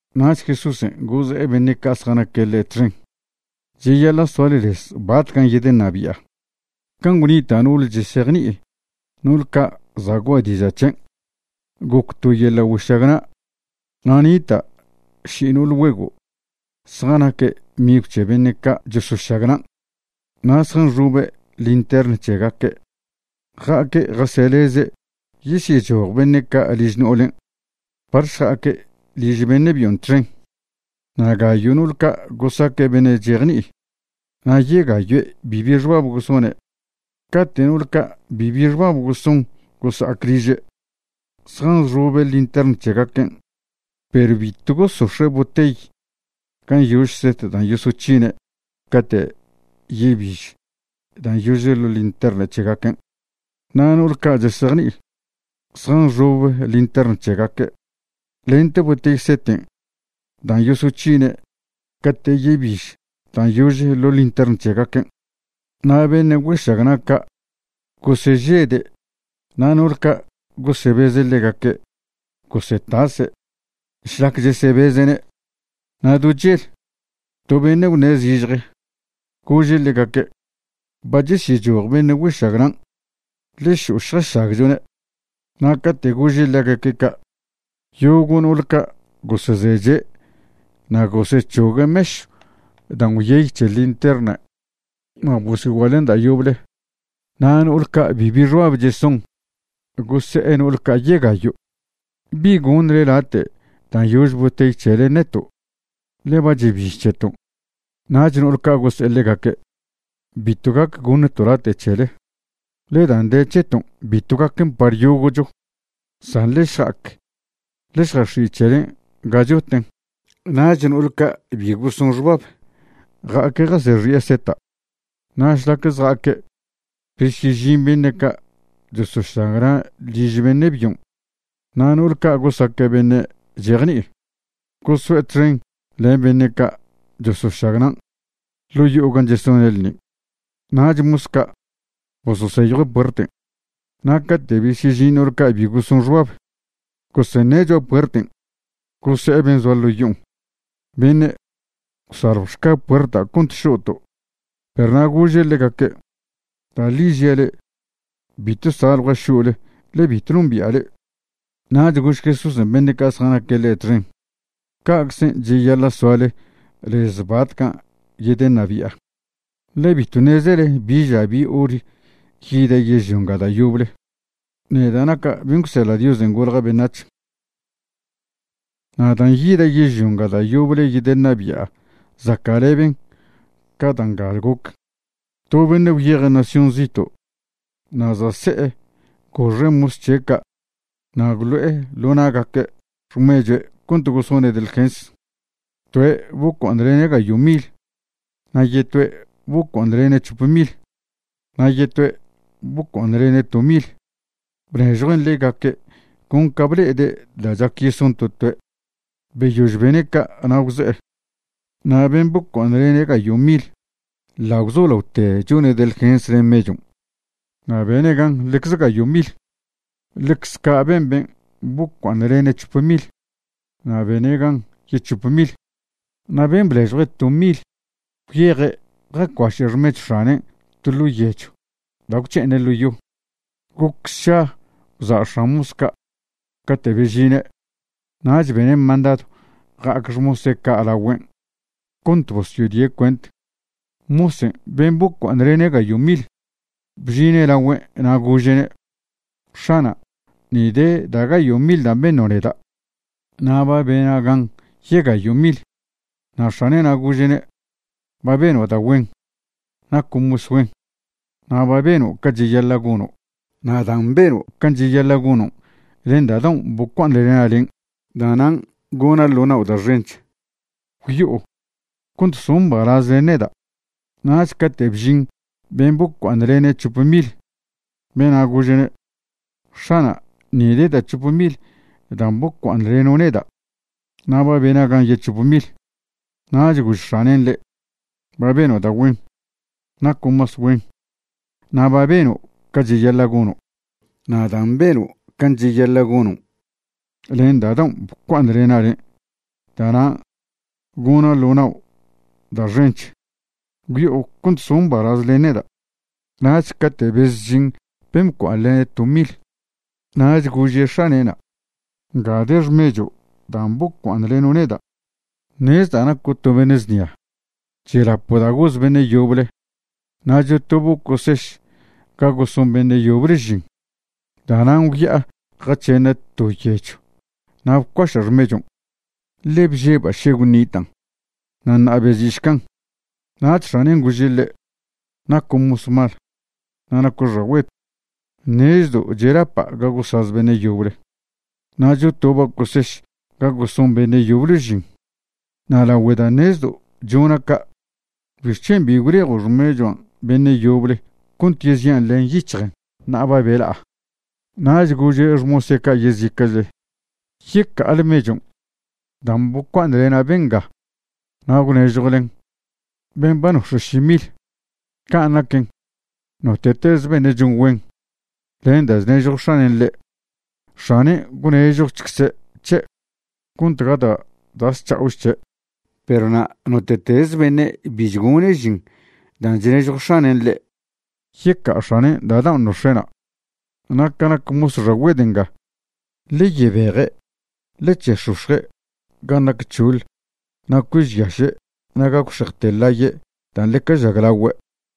Nach Jesúsen' goze'e beṉe' ca' zjanaque' ḻe' txen: ―Cheyaḻa' soale lez batcan' yedeṉabi'a, can' gwnita' no'ole chesejni'i no'ol ca' za' gua'a diža' c̱hen'. Goc to yeḻa' güešagna', na' nita' ši no'ol güego' zjanaque' migw c̱he beṉe' ca' chosošagnan'. Na' zjanxobe' lintern c̱hegaque' ja'aque' jaseleze' yesyechoj beṉe' ca' liž no'olen' par šja'aque' liž beṉe' byon' txen. Na' gayo' no'ol ca' gosaque' beṉe' chejni'i na' yegayoe' bibi xbab gosone'. Cate' no'ol ca' bibi xbab goson gosa'ac liže', zjanxobe' lintern c̱hegaquen', perw bitw gosox̱e' botey gan' yože set dan' yosoc̱hine' cate' yebiž dan' yože ḻo' lintern c̱hegaquen'. Na' no'ol ca' chesejni'i, zjanxobe' lintern c̱hegaque' lente botey seten' dan' yosoc̱hine' cate' yebiž dan' yože ḻo' lintern c̱hegaquen'. Na' beṉe' güešagna' ca' gosežede' na' no'ole ca' gosebeze' ḻegaque' gosetase' šlac chesebeze'ne'. Na' do chel, to beṉe' gwṉe' zižje, gože' ḻegaque': “Ba chesyechoj beṉe' güešagnan'. Ḻe šo'o šjašagchone'.” Na' cate' gože' ḻegaque' ca', yogo' no'ol ca' gosezeche' na' gosec̱hogue' mešw dan' gwyey c̱he linterna' na' bosyoguaḻen' da' yoble. Na' no'ol ca' bibi xbab cheson gose'e no'ol ca' yegayo': “¿Bi gonḻe late' dan' yože botey c̱helen' neto'? ḻe ba chebiž c̱heton'.” Nach no'ol ca' gose'e ḻegaque': “Bitw gac goṉto' late' c̱hele, ḻe dan' de c̱heton' bitw gaquen par yogo'cho. San ḻe šja'ac ḻe šjax̱i' c̱helen' ga choten'.” Nach no'ol ca' bi goson xbab ja'aque' jasex̱i'e seta'. Na' šlac zja'aque' besyežin beṉe' ca' chosošagna' liž beṉe' byon'. Na' no'ol ca' gosaque' beṉe' chejni'i, goso'e txen len beṉe' ca' chosošagnan' ḻo' yo'o gan' chesone' ḻṉin'. Nach mos ca' bososeyjue' puerten'. Na' cate' besyežin no'ol ca' bi goson xbab, goseṉe' cho'a puerten', gose'e ben' zoa ḻo' yo'on: “Beṉe', gwsaljwšca puerta' cont šo'to'.” Perw na' gože' ḻegaque': “Da' ḻi žia' le'e, bitw saljua' šo'le ḻe bitw nombi'a le'e.” Nach gož Jesúsen' beṉe' ca' zjanaque' ḻe' txen: ―Ca'czen' cheyaḻa' soale lez batcan' yedeṉabi'a, ḻe bitw ṉezele bi ža bi hor yida' yežlio nga da' yoble, neda' naca' ben' gwseḻa' Diosen' golja' beṉac̱h. ’Na' dan' yida' yežlio nga da' yoble yedeṉabi'a zaca'leben ca da' nga goc. To beṉe' gwyeje' nación zito'. Na' za' se'e goxe' mos c̱he' ca' na' gwlo'e ḻo na'gaque' xmechue' cont gosone' delgens. Toe' bocua'aṉlene' gayo' mil. Na' yetoe' bocua'aṉlene' c̱hop mil. Na' yetoe' bocua'aṉlene' to mil. Bnežjuen' ḻegaque' con ca ble'ede' da' chac yeson to toe'. Beyož bene' ca' na' gwze'e. Na' ben' bocua'aṉlene' gayo' mil ḻa' gwzolaote chone' delgens len mechon' na' bene' gan ḻecze gayo' mil. Ḻecze ca' ben ben' bocua'aṉlene' c̱hope mil, na' bene' gan yec̱hope mil. Na' ben' bnežjue' to mil gwyeje' jacuaše' xmechw x̱anen' to ḻo' yechw da' gwc̱he'eṉe' ḻo' yo. ’Goc šsa gwza' x̱an mos ca' cate' bežine', nach bene' mandadw ja'ac xmose' ca' lagüen' cont bosyodie' cuent. Mosen' ben' bocua'aṉlene' gayo' mil bžine' lagüen' na' gože'ne': “X̱ana', ni de da' gayo' mil dan' beṉo' neda'. Na' ba bena' gan yegayo' mil.” Na' x̱ane'na' gože'ne': “Ba beno' da' güen. Naco' mos güen na' ba beno' ca cheyaḻa' gono'. Na' dan' beno' can' cheyaḻa' gonon' len da' daon' bocua'aṉlena' len', da'nan' gona' ḻo nao' da' xench. Gwyo'o cont so' mbalaz len neda'.” Nach cate' bžin ben' bocua'aṉlene' c̱hope mil, bena' gože'ne': “X̱ana', ni de da' c̱hope mil dan' bocua'aṉleno' neda', na' ba bena' gan yec̱hope mil.” Nach gož x̱anen' ḻe': “Ba beno' da' güen. Naco' mos güen na' ba beno' ca cheyaḻa' gono'. Na' dan' beno' can' cheyaḻa' gonon' len da' daon' bocua'aṉlena' le', da'nan' gona' ḻo nao' da' xench. Gwyo'o cont so' mbalaz len neda'.” Nach cate' bezžin ben' bocua'aṉlene' to mil, nach gože' x̱ane'na': “Nga de xmecho' dan' bocua'aṉleno' neda'. Ṉezda' naco' to beṉe' znia. Chelapo' da' gosaz beṉe' yoble, na' chotobo' coseš ga goson beṉe' yoble žin. Da'nan' gwya'a jac̱he'ena' to yechw na' bcuaša' xmechon', ḻe bžeba' še gwṉitan'. Na' ṉa'a bezi'šcan'.” Nach x̱anen' gože' ḻe': “¡Naco' mos mal, na' naco' xagüed! Ṉezdo' chelapa' ga gosaz beṉe' yoble, na' chotoba' coseš ga goson beṉe' yoble žin. Na' lagüe da' ṉezdo' chona' ca' ¿bixc̱hen' bi gwlejo' xmechuan' beṉe' yoble cont yezi'an len yic̱hjen ṉa'a ba bela'a?” Nach gože' xmose' ca' yezica'chle: “Yeca'ale mechon' dan' bocua'aṉlena' benga na' gwnežjwlen ben' ba nox̱e' ši mil. Can' naquen, note'teze beṉe' chon güen len dan' chnežjo x̱anen' ḻe', x̱anen' gwnežjochcze' c̱he', cont gata' da' zc̱ha'och c̱he'. Perw na' note'teze beṉe' bi chgone' žin dan' chnežjo x̱anen' ḻe', yeca'a x̱anen' da' daon' nox̱e'na'. Na' ca nac mos xagüed nga, ḻe yebeje' ḻe c̱he'ex̱ox̱je' gan' nac c̱hoḻ na' cuežyaše' na' gagwxejte ḻaye' dan' ḻeca žaglagüe'.”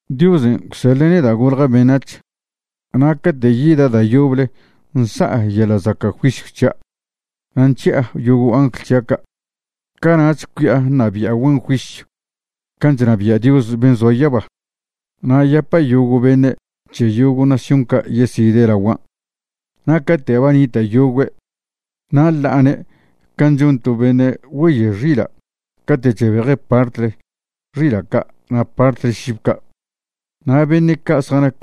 ’Diosen' gwseḻe' neda' golja' beṉac̱h, na' cate' yida' da' yoble nsa'a yeḻa' zaca' juisyw c̱hia' na' nc̱hi'a yogo' angl c̱hia' ca', cana'ch cui'a ṉabi'a güen juisyw can' chnabia' Dios ben' zoa yaba. Na' yapa' yogo' beṉe' c̱he yogo' nación ca' yeside' laguan'. Na' cate' ba nita' yogüe' na' ḻa'ane' can' chon to beṉe' güeye xila' cate' chebeje' partle xila' ca' na' partle šib ca'. Na' beṉe' ca' zjanac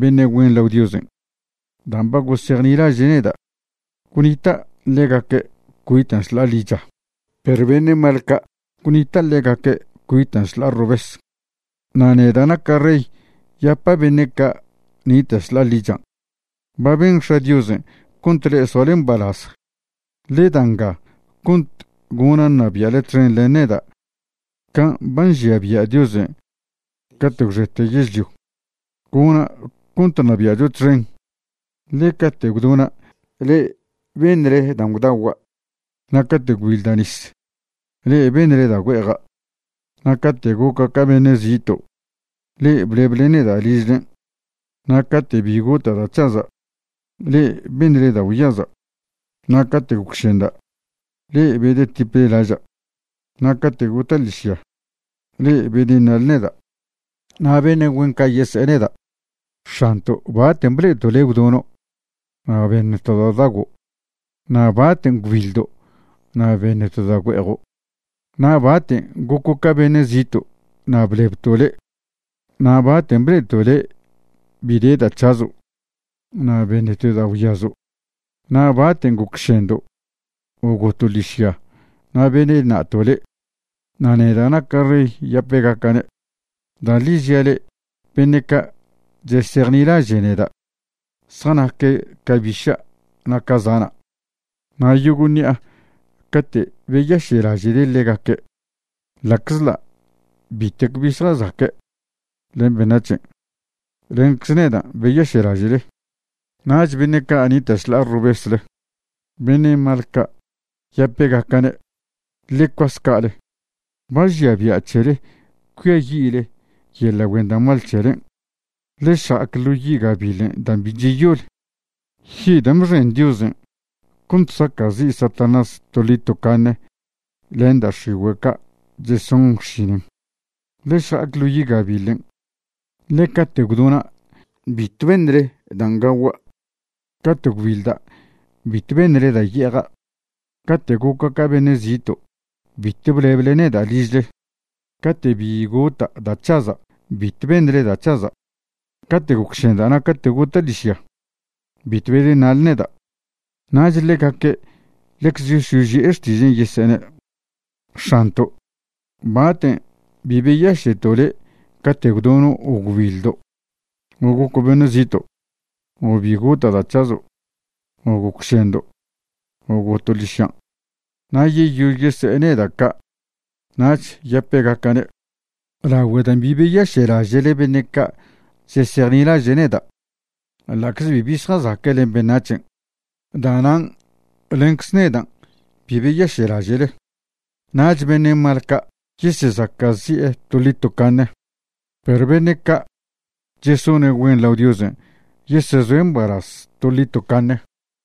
beṉe' güen lao Diosen' dan' ba gosejnilaže' neda', gwnita' ḻegaque' cuitan' šḻa'a ḻicha. Perw beṉe' mal ca', gwnita' ḻegaque' cuitan' šḻa'a robes. Na' neda' naca' rey yapa' beṉe' ca' nita' šḻa'a ḻichan': “Ba ben X̱a' Diosen' cont le'e soale mbalaz. Ḻe da nga cont gona' ṉabia'le txen len neda' can' ba nžia bia' Diosen' cate' gwxete yežlio. Gona' cont ṉabia'cho txen, ḻe cate' gwdona' le'e beṉle dan' gwdagua'. Na' cate' gwbiḻda' nis, le'e beṉle da' güe'eja'. Na' cate' goca' ca beṉe' zito' le'e bleble neda' ližlen'. Na' cate' bi gota' da' c̱haza', le'e beṉle da' gwyaza'. Na' cate' gocšenda', le'e bedetiple laža'. Na' cate' gota' ḻižya, le'e bedeṉa'le neda'.” Na' beṉe' güen ca' yese'e neda': “X̱anto', ¿baten' ble'eto' le' gwdono' na' beṉto' da' gwdago'? Na' ¿baten' gwbiḻdo' na' beṉto' da' güe'ejo'? Na' ¿baten' goco' ca beṉe' zito' na' blebto' le'? Na' ¿baten' ble'eto' le' bi de da' c̱hazo' na' beṉto' da' gwyazo'? Na' ¿baten' gocšendo' o goto' ḻižya na' bedeṉa'to' le'?” Na' neda' naca' rey yape'gaca'ne': “Da' ḻi žia' le'e, beṉe' ca' chesejnilaže' neda' zjanaque' ca biša' na' ca zana'. Na' yogo' ṉi'a cate' beyaše'laže'le ḻegaque', ḻa'czḻa' bitec bi zjazaque' len beṉac̱hen', lencze nedan' beyaše'laže'le.” ’Nach beṉe' ca' nita' šḻa'a robesle, beṉe' mal ca', yape'gaca'ne': “Ḻe cuas ca'ale. Ba žia bia' c̱hele cuiayi'le yeḻa' güen da' mal c̱helen'. Ḻe šja'ac ḻo yi' gabiḻ dan' bi cheyol, yi' dan' bxen Diosen' cont saca'zi' Satanás toḻi tocaṉe len da' x̱igüe' ca' cheson xšinen. Ḻe šja'ac ḻo yi' gabiḻen', ḻe cate' gwdona' bitw beṉle dan' gagua'. Cate' gwbiḻda' bitw beṉle da' ye'eja'. Cate' goca' ca beṉe' zito' bitw bleble neda' ližle. Cate' bi gota' da' c̱haza' bitw beṉle da' c̱haza'. Cate' gocšenda' na' cate' gota' ḻižya, bitw bedeṉa'le neda'.” Nach ḻegaque' ḻecze yosyoži'e xtižan' yesene': “X̱anto', ¿baten' bi beyaše'to' le' cate' gwdono' o gwbiḻdo', o goco' beṉe' zito', o bi gota' da' c̱hazo', o gocšendo', o goto' ḻižyan'?” Na' yeyož yese'e neda' ca' nach yape'gaca'ne': “Lagüe' dan' bi beyaše'laže'le beṉe' ca' chesejnilaže' neda', ḻa'cze bibi zjazaque' len beṉac̱hen', da'nan' lencze nedan' bi beyaše'laže'le.” Nach beṉe' mal ca' yesezaca'zi'e toḻi tocaṉe. Perw beṉe' ca' chesone' güen lao Diosen' yesezoe' mbalaz toḻi tocaṉe.